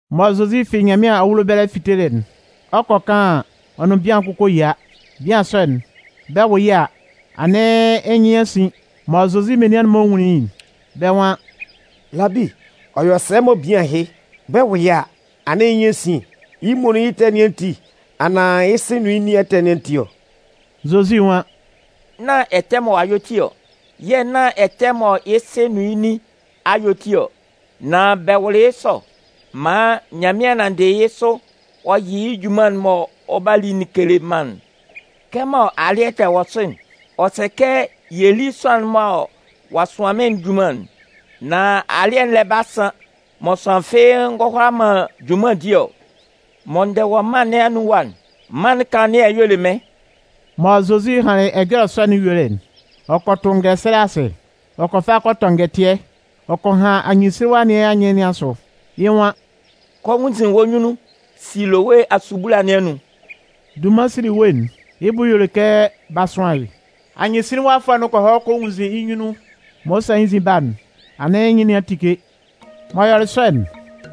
Mɔ Zozi fi Nyanmɩan awulo ɛbɛlɛ fitelɩ'n, ɔ 'kɔ kaan an, ɔ nʋn bian kʋn kɔ yia. Bian sɔ'n, bɛ 'wʋ yɩ́ a, anɩn yɩ́ nyɩn a sin. Mɔ Zozi menian'n-mɔ nwunlin yɩ́'n, bɛ́ nwan: “Labi, ɔ yɔ sɛ mɔ bian ɛhɩ, bɛ 'wʋ yɩ́ a, anɩn yɩ́ nyɩn a sin'n? Yɩ́ muonun yɩ́ ɛtɛ nɩn ati anaan yɩ́ sɩ nʋn yɩ́ nin ɛtɛ nɩn ati ɔ?” Zozi nwan: “Nán ɛtɛ mɔ ɔ'a yɔ ti ɔ, yɛ̂ nán ɛtɛ mɔ yɩ́ sɩ nʋn yɩ́ nin a yɔ ti ɔ. Nan bɛ wʋlɩ yɩ́ sɔ maan Nyanmɩan nanndɩ yɩ́ sʋ ɔ yɩ yɩ́ junman'n mɔ ɔ 'ba li'n kele mân'n. Kɛmɔ alɩ́ɛ'n tɛ wɔ sʋ'n, ɔ sɛ kɛ yɛ lí sʋanlan'n mɔ ɔ'a sʋan mɩ́n'n junman'n. Nan alɩ́ɛ'n lɛ 'ba san mɔ sʋanlan fɩ́ɩ́ ngɔ hʋala man junman di ɔ. Mɔ n dɛ wɔ mân nɩn anun ɛwa'n, mân'n kanlannɩɛ'n y'ɔ le mɩ́n.” Mɔ Zozi hanlɩn ɛjɔlɛ sɔ'n yuelɩ'n, ɔ kɔ tʋ ngɛsɛlɛ asɩ, ɔ kɔ fa kɔ fɔtɔ ngɛtɩɛ, ɔ kɔ han anyɩnsinlinwafʋɛ nɩn anyɩn nɩn asʋ. Yɩ́ nwan: “Kɔ nwunnzin wɔ́ nyunnun Silowe asubula nɩn anun.” (Dunman Silowe'n, yɩ́ bʋ y'ɔ le kɛ b'a sʋan yɩ́.) Anyɩnsinlinwafʋɛ'n kɔ hɔ kɔ nwunnzin yɩ́ nyunnun. Mɔ ɔ 'sa yɩ́ nzin ba'n, anɩn yɩ́ nyɩn nɩn a tike. M'ɔ yɔlɩ sɔ'n,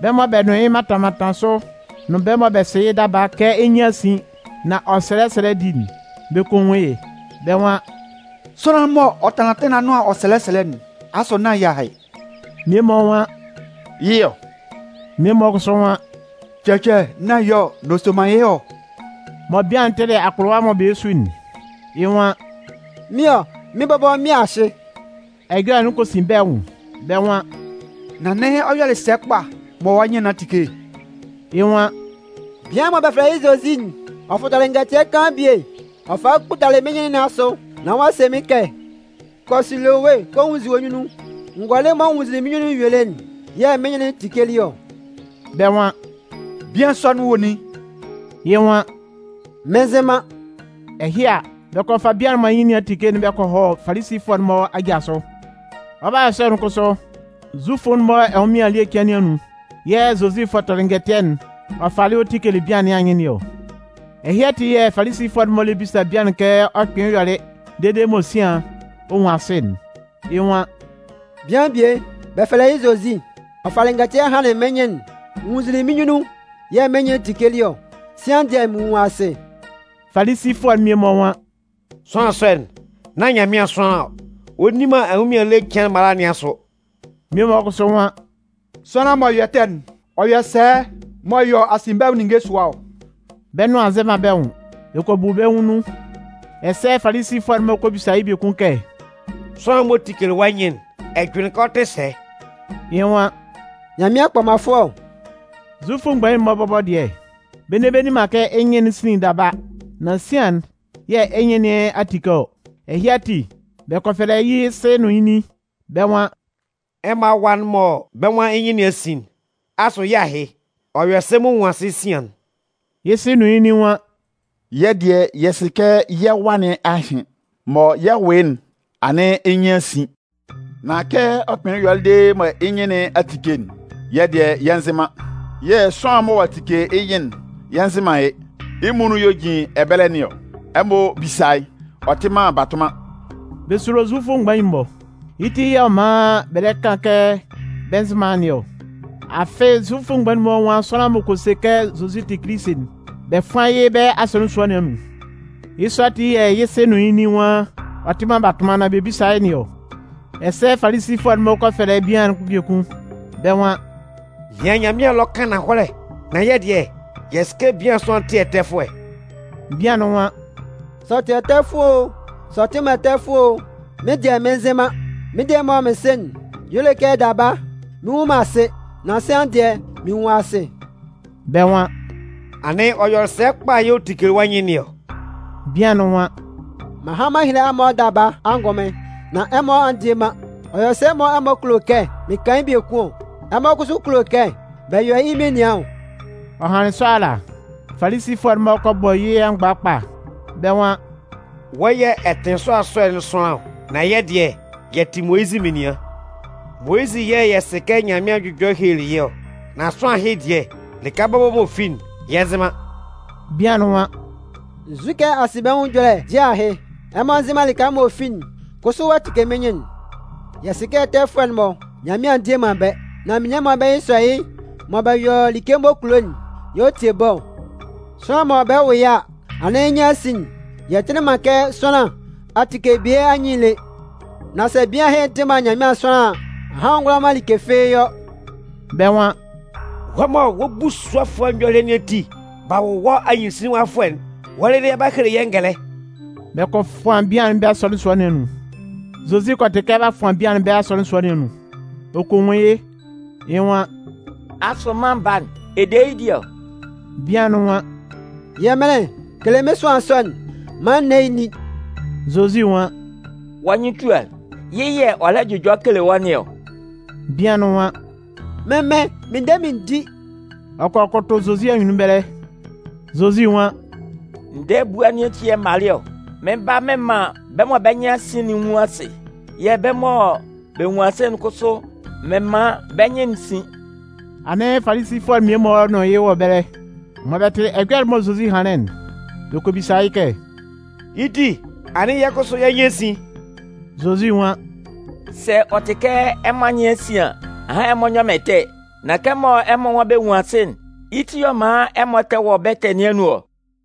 bɛ́ mɔ bɛ nʋn yɩ́ mantan mantan sʋ nʋn bɛ́ mɔ bɛ sɩ yɩ́ daba kɛ yɩ́ nyɩn a sin nán ɔ sɛlɛ sɛlɛ di'n, bɛ kɔ nwun yɩ́. Bɛ́ nwan: “Sʋanlan'n m'ɔ tanlan atɩn nɩn anʋan ɔ sɛlɛ sɛlɛ'n, asʋ nán yɩ́ ahɩ?” Mmie-mɔ nwan: “Yɩ́ ɔ.” Mmie-mɔ kʋsʋ nwan: “Cɛcɛ, nán yɩ́ ɔ, nan ɔ soman yɩ́ hɔ ɔ.” Mɔ bian'n tɩlɩ akpʋlʋwa'n mɔ bɛ lɛ su'n, yɩ́ nwan: “Mɩ́n ɔ, mɩ́n bɔbɔ mɩ́n ahɩ.” Ɛjɔlɛ'n kɔ sin bɛ́ nwʋn, bɛ́ nwan: “Nan anɩn ɔ yɔlɩ sɛ kpa mɔ wɔ́ nyɩn nɩn a tike'n?” Yɩ́ nwan: “Bian'n mɔ bɛ fɛlɛ yɩ́ Zozi'n, ɔ fɔtɔlɩ ngɛtɩɛ kaan bie ɔ falɩ ɔ kputalɩ mɩ́n nyɩn nɩn asʋ nán ɔ'a se mɩ́n kɛ: ‘Kɔ Siloe kɔ nwunnzin wɔ́ nyunnun.’ N gɔlɩ mɔ n nwunnzinlin mɩ́n nyunnun yuelɩ'n yɛ̂ mɩ́n nyɩn'n tikelɩ ɔ.” Bɛ́ nwan: “Bian sɔ'n wɔ nin?” Yɩ́ nwan: “Mɩn nzɩ man.” Ɛhɩ a, bɛ kɔ fa bian'n mɔ yɩ́ nyɩn nɩn a tike'n bɛ kɔ hɔ Falisifʋɛ'n-mɔ aja sʋ. Ɔ 'ba yɔ sɔ'n kʋsʋ, Zufʋ'n-mɔ ɛnwʋnmɩan ele cɩan nɩn anun yɛ̂ Zozi fɔtɔlɩ ngɛtɩɛ'n ɔ falɩ ɔ tikelɩ bian nɩn anyɩn nɩn ɔ. Ɛhɩ ati yɛ̂ Falisifʋɛ'n-mɔ lɛ bisa bian'n kɛ ɔ kpɩnlɩn yɔlɩ dede mɔ sian ɔ nwun asɩ'n. Yɩ́ nwan: “Bian bie, bɛ fɛlɛ yɩ́ Zozi, ɔ falɩ ngɛtɩɛ hanlɩn mɩ́n nyɩn'n, n nwunnzinlin mɩ́n nyunnun yɛ̂ mɩ́n nyɩn'n tikelɩ ɔ. Sian dɩɛ mɩn nwun asɩ.” Falisifʋɛ'n mmie-mɔ nwan: “Sʋanlan sɔ'n, nán Nyanmɩan sʋanlan ɔ. Ɔ nni man ɛnwʋnmɩan ele cɩan'n mala nɩn asʋ.” Mmie-mɔ kʋsʋ nwan: “Sʋanlan m'ɔ yɔ ɛtɛ'n, ɔ yɔ sɛ m'ɔ yɔ asinbɛnwʋn ninnge sʋa ɔ?” Bɛ́ nʋan a nzɛ man bɛ́ nwʋn. Bɛ kɔ bu bɛ́ nwʋn nun. Ɛsɛ Falisifʋɛ'n-mɔ kɔ bisa yɩ́ biekun kɛ: “Sʋanlan'n m'ɔ tikelɩ wɔ́ nyɩn'n, ɛ jʋnlɩn kɛ ɔ tɩ sɛ?” Yɩ́ nwan: “Nyanmɩan kpɔmanfʋɛ ɔ.” Zufʋ mgbain'n-mɔ bɔbɔ dɩɛ, bɛ nne bɛ nni man kɛ yɩ́ nyɩn'n sinlin daba, nan sian'n yɛ̂ yɩ́ nyɩn nɩn a tike ɔ. Ɛhɩ ati, bɛ kɔ fɛlɛ yɩ́ sɩ nʋn yɩ́ nin. Bɛ́ nwan: “Ɛmɔ awa'n mɔ bɛ́ nwan yɩ́ nyɩn nɩn a sin'n, asʋ yɩ́ ahɩ? Ɔ yɔ sɛ m'ɔ nwun asɩ sian'n?” Yɩ́ sɩ nʋn yɩ́ nin nwan: “Yɛ́ dɩɛ, yɛ sɩ kɛ yɛ́ wa nɩn ahɩ. Mɔ yɛ 'wʋ yɩ́'n, anɩn yɩ́ nyɩn nɩn a sin. Nan kɛ ɔ kpɩnlɩn yɔlɩ dede mɔ yɩ́ nyɩn nɩn a tike'n, yɩ́ dɩɛ yɛ nzɩ man. Yɛ̂ sʋanlan'n mɔ ɔ'a tike yɩ́ nyɩn'n, yɛ nzɩ man yɩ́. Yɩ́ muonun yɛ̂ ɔ jin ɛbɛlɛ nɩn ɔ. Ɛmɔ bísa yɩ́, ɔ tɩ man batʋnman!” Bɛ sulo Zufʋ mgbain'n-mɔ, yɩ́ ti yɛ̂ ɔ man bɛ lɛ kan kɛ bɛ nzɩ man nɩn ɔ. Afɩ Zufʋ mgbain'n-mɔ nwan sʋanlan m'ɔ kɔ se kɛ Zozi tɩ Kilisi'n, bɛ 'fʋan yɩ́ bɛ́ asɔnɩn sua nɩn anun. Yɩ́ sɔ ati yɛ̂ yɩ́ sɩ nʋn yɩ́ nin nwan ɔ tɩ man batʋnman nán bɛ bísa yɩ́ nɩn ɔ. Ɛsɛ Falisifʋɛ'n-mɔ kɔ fɛlɛ bian'n biekun, bɛ́ nwan: “Nɩan Nyanmɩan ɛlɔ kan ananhɔlɛ. Nan yɛ́ dɩɛ, yɛ sɩ kɛ bian sɔ'n tɩ ɛtɛfʋɛ.” Bian'n nwan: “Sɛ ɔ tɩ ɛtɛfʋɛ o, sɛ ɔ tɩ man ɛtɛfʋɛ o, mɩ́n dɩɛ, mɩn nzɩ man. Mɩ́n dɩɛ mɔ mɩn sɩ'n y'ɔ le kɛ daba mɩn nnwun man asɩ, nan sian dɩɛ, mɩn nwun asɩ.” Bɛ́ nwan: “Anɩn ɔ yɔlɩ sɛ kpa yɛ̂ ɔ tikelɩ wɔ́ nyɩn nɩn ɔ?” Bian'n nwan: “M'an han m'an hele ɛmɔ daba angʋnmɩn, nan ɛmɔ a ndie man. Ɔ yɔ sɛ mɔ ɛmɔ kulo kɛ mɩn kan yɩ́ biekun ɔ? Ɛmɔ kʋsʋ kulo kɛ bɛ yɔ yɩ́ menian ɔ?” Ɔ hanlɩn sɔ ala, Falisifʋɛ'n-mɔ kɔ bɔ yɩ́ amgba kpa. Bɛ́ nwan: “Wɔ́ yɛ̂ ɛ tɩ sʋanlan sɔ'n sʋanlan ɔ, nan yɛ́ dɩɛ yɛ tɩ Moyizɩ menian. Moyizɩ yɛ̂ yɛ sɩ kɛ Nyanmɩan jʋjɔlɩ helelɩ yɩ́ ɔ. Nan sʋanlan ɛhɩ dɩɛ, lɩka bɔbɔ m'ɔ fi'n, yɛ nzɩ man.” Bian'n nwan: “Nzukɛ asinbɛnwʋn ɛjɔlɛ dɩɛ ahɩ? Ɛmɔ nzɩ man lɩka m'ɔ fi'n kʋsʋ ɔ'a tike mɩ́n nyɩn'n! Yɛ sɩ kɛ ɛtɛfʋɛ'n-mɔ, Nyanmɩan ndie man bɛ́. Nan menian mɔ bɛ́ nyɩn sɔ yɩ́ mɔ bɛ yɔ like m'ɔ kulo'n yɛ̂ ɔ tie bɛ́ ɔ. Sʋanlan mɔ bɛ 'wʋ yɩ́ a, anɩn yɩ́ nyɩn nɩn a sin'n, yɛ tɩlɩ man kɛ sʋanlan a tike bie anyɩn'n lé. Nan sɛ bian ɛhɩ tɩ man Nyanmɩan sʋanlan an, ahan ɔ ngʋala man like fɩ́ɩ́ yɔ.” Bɛ́ nwan: “Wɔ́ mɔ wɔ́ busuɔfʋɛ nyɔlɩɛ nɩn ati b'a wʋ wɔ́ anyɩnsinlinwafʋɛ'n, wɔ́ lɩlɩ ɛ 'ba hele yɛ́ ngɛlɛ?” Bɛ kɔ fʋan bian'n bɛ́ asɔnɩn sua nɩn anun. Zozi kɔ tɩ kɛ b'a fʋan bian'n bɛ́ asɔnɩn sua nɩn anun, ɔ kɔ nwun yɩ́, yɩ́ nwan: “Asʋ Mân Baa'n, ɛ de yɩ́ di ɔ?” Bian'n nwan: “Yɛmɩnlɩn, kele mɩ́n sʋanlan sɔ'n maan n né yɩ́ n ní.” Zozi nwan: “Wɔ́ nyɩn tua yɩ́. Yɩ́ yɛ̂ ɔ lɛ jʋjɔ kele wɔ́ nɩn ɔ.” Bian'n nwan: “Mɩ́n Mɩn, mɩn de mɩn di.” Ɔ kɔ kʋtʋ Zozi anyunnun ɛbɛlɛ. Zozi nwan: “Ndɛɛ ebua nɩn ati yɛ̂ m malɩ ɔ. Mɩn 'ba nán mɩn man bɛ́ mɔ bɛ́ nyɩn a sin'n nwun asɩ. Yɛ̂ bɛ́ mɔ bɛ nwun asɩ'n kʋsʋ, mɩn man bɛ́ nyɩn'n sin.” Anɩn Falisifʋɛ'n mmie-mɔ nʋn yɩ́ wɔ ɛbɛlɛ. Mɔ bɛ tɩlɩ ɛjɔlɛ'n mɔ Zozi hanlɩn'n, bɛ kɔ bisa yɩ́ kɛ: “Yɩ́ ti, anɩn yɛ́ kʋsʋ yɛ́ nyɩn a sin?” Zozi nwan: “Sɛ ɔ tɩ kɛ ɛmɔ anyɩn a sin an, ahan ɛmɔ nyɔ man ɛtɛ. Nan kɛmɔ ɛmɔ nwan bɛ nwun asɩ'n, yɩ́ ti yɛ̂ ɔ man ɛmɔ tɛ wɔ bɛ́ ɛtɛ nɩn anun ɔ.”